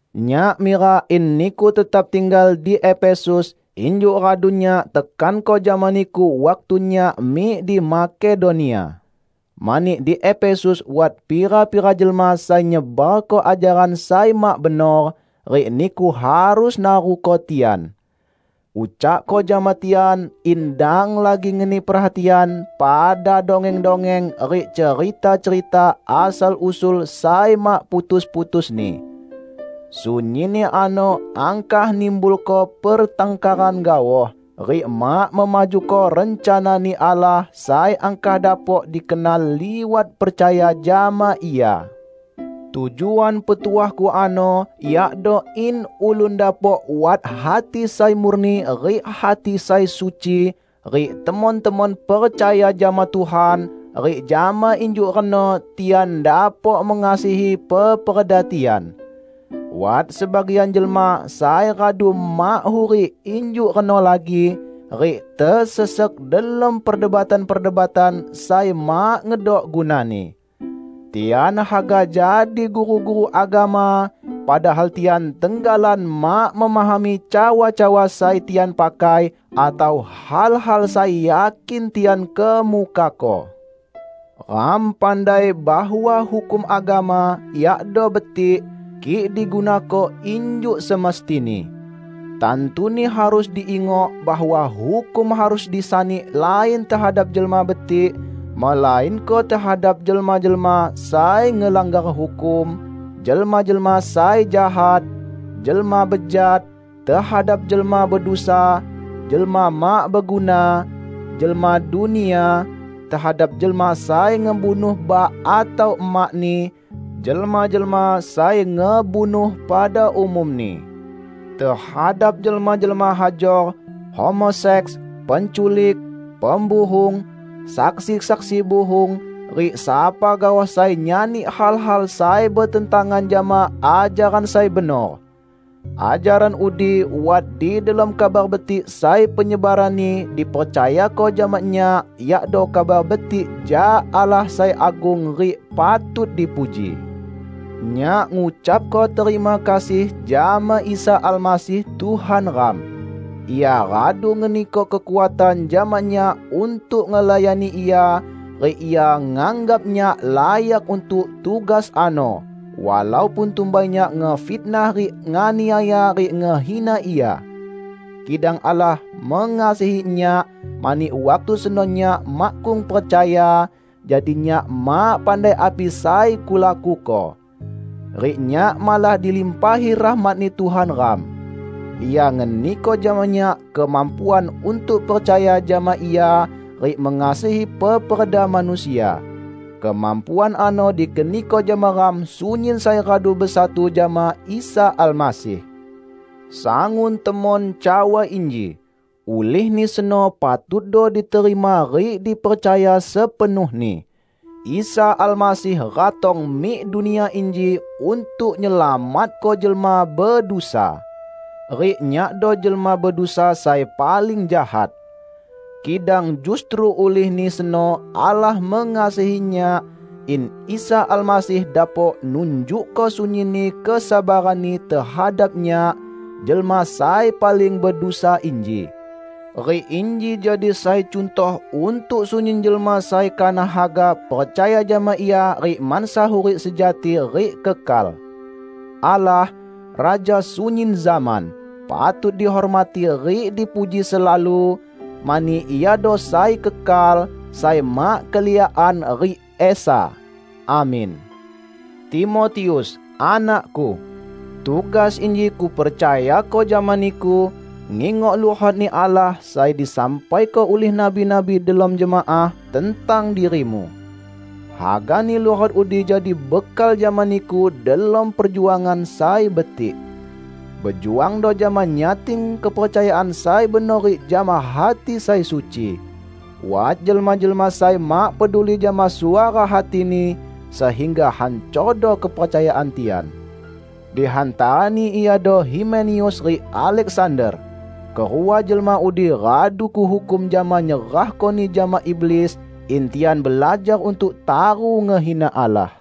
Nyak mirak in niku tetap tinggal di Efesus injuk radu nyak tekanko jama niku waktu nyak mik di Makedonia. Mani, di Efesus wat pira-pira jelma sai nyebarko ajaran sai mak benor, rik niku harus naruko tian. Ucakko jama tian in dang lagi ngeni perhatian pada dongeng-dongeng rik cerita-cerita asal-usul sai mak putus-putusni. Sunyinni ano angkah nimbulko pertangkaran gaoh, rik mak memajuko rencana-Ni Allah sai angkah dapok dikenal liwat percaya jama Ia. Tujuan petuahku ano yakdo in ulun dapok wat hati sai murni rik hati sai suci, rik temon-temon percaya jama Tuhan, rik jama injuk reno tian dapok mengasihi peperda tian. Wat sebagian jelma sai radu mak hurik injuk reno lagi, rik tesesek delom perdebatan-perdebatan sai mak ngedok gunani. Tian haga jadi guru-guru agama, padahal tian tenggalan mak memahami cawa-cawa sai tian pakai atau hal-hal sai yakin tian kemukako. Ram pandai bahwa hukum agama yakdo betik, kik digunako injuk semestini. Tantuni harus diingok bahwa hukum harus disani lain tehadap jelma betik, melainko tehadap jelma-jelma sai ngelanggar hukum, jelma-jelma sai jahat, jelma bejat, tehadap jelma bedusa, jelma mak beguna, jelma dunia, tehadap jelma sai ngebunuh bak atau emakni, jelma-jelma sai ngebunuh pada umumni, tehadap jelma-jelma hajor, homoseks, penculik, pembuhung; saksi-saksi buhung, rik sapa gaoh sai nyani hal-hal sai betentangan jama ajaran sai benor. Ajaran udi wat di delom Kabar Betik sai penyebaranni dipercayako jama nyak, yakdo Kabar Betik jak Allah sai agung rik patut dipuji. Nyak ngucapko terima kasih jama Isa Almasih Tuhan ram. Ia radu ngeniko kekuatan jama nyak untuk ngelayani Ia, rik Ia nganggap nyak layak untuk tugas ano, walaupun tumbai nyak ngefitnah rik nganiaya rik ngehina Ia. Kidang Allah mengasihani nyak, mani waktu seno nyak makkung percaya, jadi nyak mak pandai api sai kulakuko. Rik nyak malah dilimpahi rahmat-Ni Tuhan ram. Ia ngeniko jama nyak kemampuan untuk percaya jama Ia rik mengasihi peperda manusia. Kemampuan ano dikeniko jama ram sunyin sai radu besatu jama Isa Almasih. Sangun temon cawa inji -- ulihni seno patutdo diterima rik dipercaya sepenuhni --: "Isa Almasih ratong mik dunia inji untuk nyelamatko jelma bedusa." Rik nyakdo jelma bedusa sai paling jahat. Kidang justru ulihni seno Allah mengasihi nyak, in Isa Almasih dapok nunjukko sunyinni kesabaran-Ni tehadap nyak, jelma sai paling bedusa inji. Rik inji jadi sai cuntoh untuk sunyin jelma sai kanah haga percaya jama Ia rik mansa hurik sejati rik kekal. Allah, Raja sunyin zaman, patut dihormati rik dipuji selalu, mani Iado sai kekal, sai mak keliakan rik esa! Amin. Timotius, anakku! Tugas inji kupercayako jama niku, ngingok luhot-Ni Allah sai disampaiko ulih nabi-nabi delom jemaah tentang dirimu. Hagani luhot udi jadi bekal jama niku delom perjuangan sai betik. Bejuangdo jama nyating kepercayaan sai benor rik jama hati sai suci. Wat jelma-jelma sai mak peduli jama suara hatini, sehingga hancordo kepercayaan tian. Di hantarani iado Himeneus rik Aleksander. Kerua jelma udi radu kuhukum jama nyerahkoni jama iblis, in tian belajar untuk taru ngehina Allah.